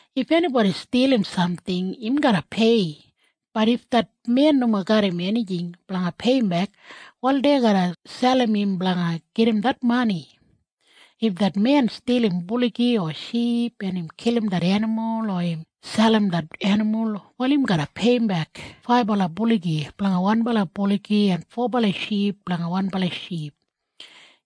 If enibodi stilim samting, im garra pei. Bat if det men nomo garram enijing blanga peiyimbek, wal dei garra selim im blanga gedim det mani. If det men stilim buligi o ship, en im kilim det enimul o im selim det enimul, wal im garra peiyimbek faibala buligi blanga wanbala buligi en fobala ship blanga wanbala ship.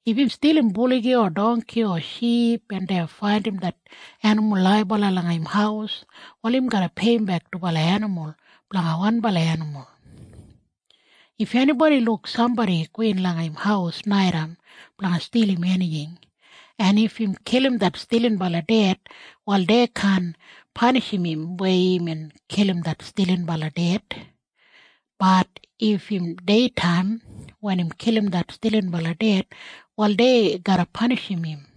If im stilim buligi o dongki o ship, en dei faindim det enimul laibala langa im haus, wal im garra peiyimbek dubala enimul blanga wanbala enimul. If enibodi luk sambodi gowin langa im haus naitaim blanga stilim enijing, en if im kilim det stilinbala ded, wal dei kaan panishim im weya imbin kilim det stilinbala ded. Bat if im deitaim wen im kilim det stilinbala ded, wal dei garra panishim im.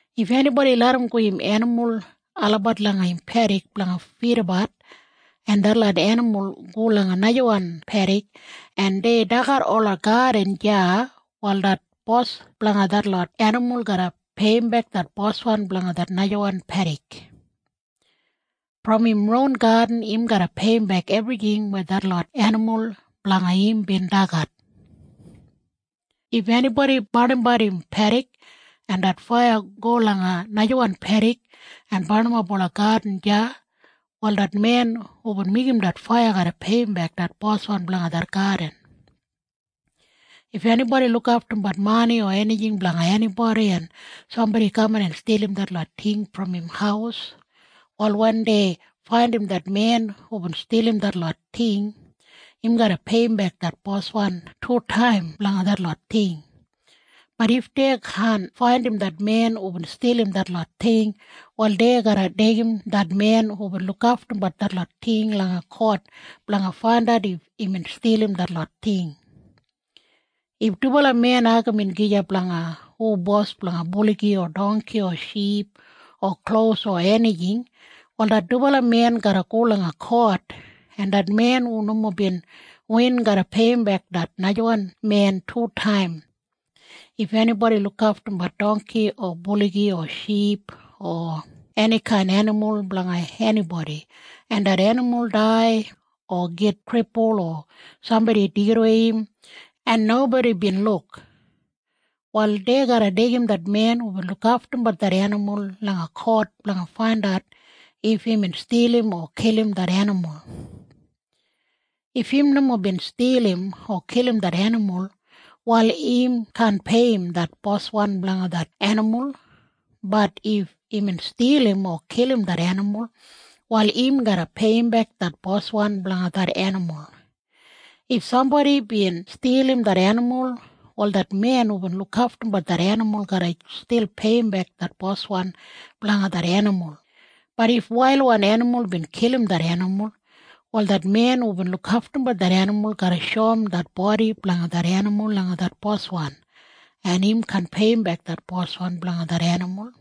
If enibodi larramgo im enimul olabat langa im pedik blanga fidabat, en detlot enimul go langa najawan pedik, en dei dagat ola gadin deya, wal det bos blanga detlot enimul garra peiyimbek det boswan blanga det najawan pedik. Brom im ron gadin im garra peiyimbek ebrijing weya detlot enimul blanga im bin dagat. If enibodi barnimbat im pedik, en det faiya go langa najawan pedik en barnimap ola gadin deya, wal det men hubin meigim det faiya garra peiyimbek det boswan blanga det gadin. If enibodi lukaftumbat mani o enijing blanga enibodi, en sambodi kaman en stilim detlot ting brom im haus, wal wen dei faindim det men hubin stilim detlot ting, im garra peiyimbek det boswan tutaim blanga detlot ting. Bat if dei kaan faindim det men hubin stilim detlot ting, wal dei garra deigim det men hubin lukaftumbat detlot ting langa kot blanga faindat if imbin stilim detlot ting. If dubala men agamin gija blanga hu bos blanga buligi o dongki o ship o klos o enijing, wal det dubala men garra go langa kot, en det men hu nomo bin win garra peiyimbek det najawan men tutaim. If enibodi lukaftumbat dongki o buligi o ship o enikain enimul blanga enibodi, en det enimul dai o git kripul o sambodi deigidawei im, en nobodi bin luk, wal dei garra deigim det men hubin lukaftumbat det enimul langa kot blanga faindat if imbin stilim o kilim det enimul. If im nomo bin stilim o kilim det enimul, wal im kaan peiyim det boswan blanga det enimul. Bat if imbin stilim o kilim det enimul, wal im garra peiyimbek det boswan blanga det enimul. If sambodi bin stilim det enimul, wal det men hubin lukaftumbat det enimul garra stil peiyimbek det boswan blanga det enimul. Bat if wailwan enimul bin kilim det enimul, wal det men hubin lukaftumbat det enimul garra shoum det bodi blanga det enimul langa det boswan, en im kaan peiyimbek det boswan blanga det enimul.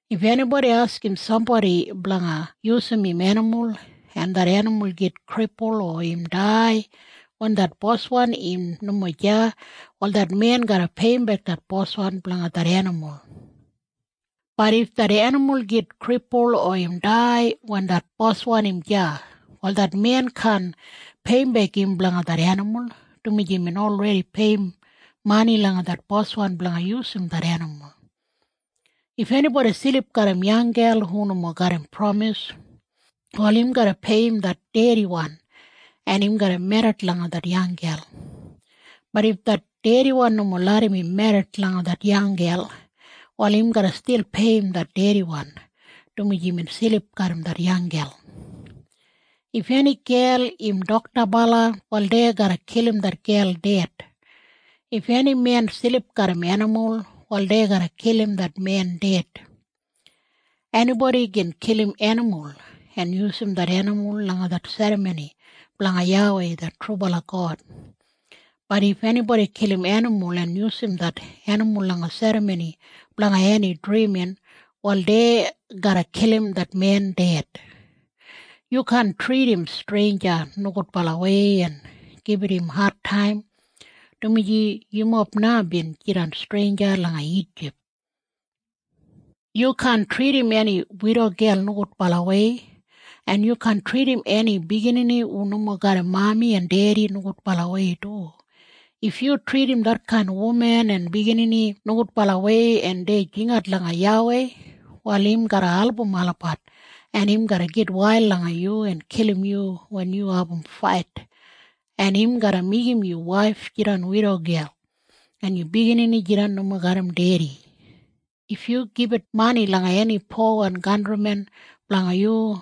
If enibodi askim sambodi blanga yusum im enimul, en det enimul git kripul o im dai wen det boswan im nomo deya, wal det men garra peiyimbek det boswan blanga det enimul. Bat if det enimul git kripul o im dai wen det boswan im deya, wal det men kaan peiyimbek im blanga det enimul, dumaji imbin olredi peiyim mani langa det boswan blanga yusum det enimul. If enibodi silip garram yanggel hu nomo garram pramis, wal im garra peiyim det dediwan, en im garra merrit langa det yanggel. Bat if det dediwan nomo larram im merrit langa det yanggel, wal im garra stil peiyim det dediwan, dumaji imbin silip garram det yanggel. If eni gel im doktabala, wal dei garra kilim det gel ded. If eni men silip garram enimul, wal dei garra kilim det men ded. Enibodi gin kilim enimul en yusum det enimul langa det serramoni blanga YAWEI det trubala God. Bat if enibodi kilim enimul en yusum det enimul langa serramoni blanga eni drimin, wal dei garra kilim det men ded. Yu kaan tridim streinja nogudbalawei en gibit im adtaim, dumaji yumob na bin jidan streinja langa Ijip. Yu kaan tridim eni widogel nogudbalawei, en yu kaan tridim eni biginini hu nomo garram mami en dedi nogudbalawei du. If yu tridim detkain wuman en biginini nogudbalawei, en dei jingat langa YAWEI, wal im garra album olabat, en im garra gitwail langa yu en kilim yu wen yu abum fait, en im garra meigim yu waif jidan widogel en yu biginini jidan nomo garram dedi. If yu gibit mani langa eni powan kantrimen blanga yu,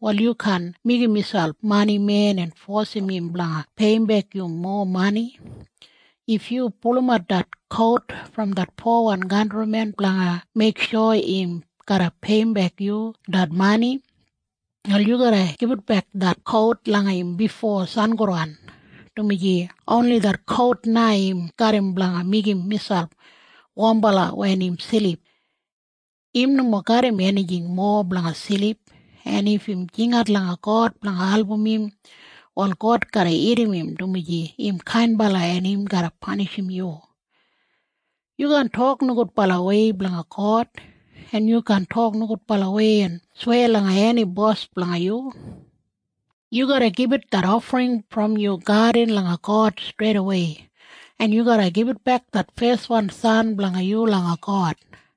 wal yu kaan meigim miselp manimen en fosim im blanga peiyimbek yu mowa mani. If yu pulumat det kout brom det powan kantrimen blanga meiksho im garra peiyimbek yu det mani, wal yu garra gibitbek det kout langa im bifo sangodan, dumaji oni det kout na im garram blanga meigim miselp wombala wen im silip. Im nomo garram enijing mowa blanga silip, en if im jingat langa God blanga album im, wal God garra irrim im, dumaji im kainbala, en im garra panishim yu. Yu kaan tok nogudbalawei blanga God, en yu kaan tok nogudbalawei en sweya langa eni bos blanga yu. Yu garra gibit det ofring brom yu gadin langa God streidawei, en yu garra gibitbek det feswan san blanga yu langa God,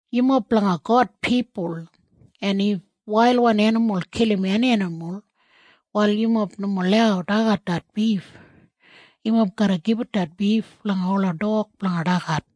Yumob blanga God pipul, en if wailwan enimul kilim eni enimul, wal yumob nomo lau dagat det bif. Yumob garra gibit det bif langa ola dog blanga dagat.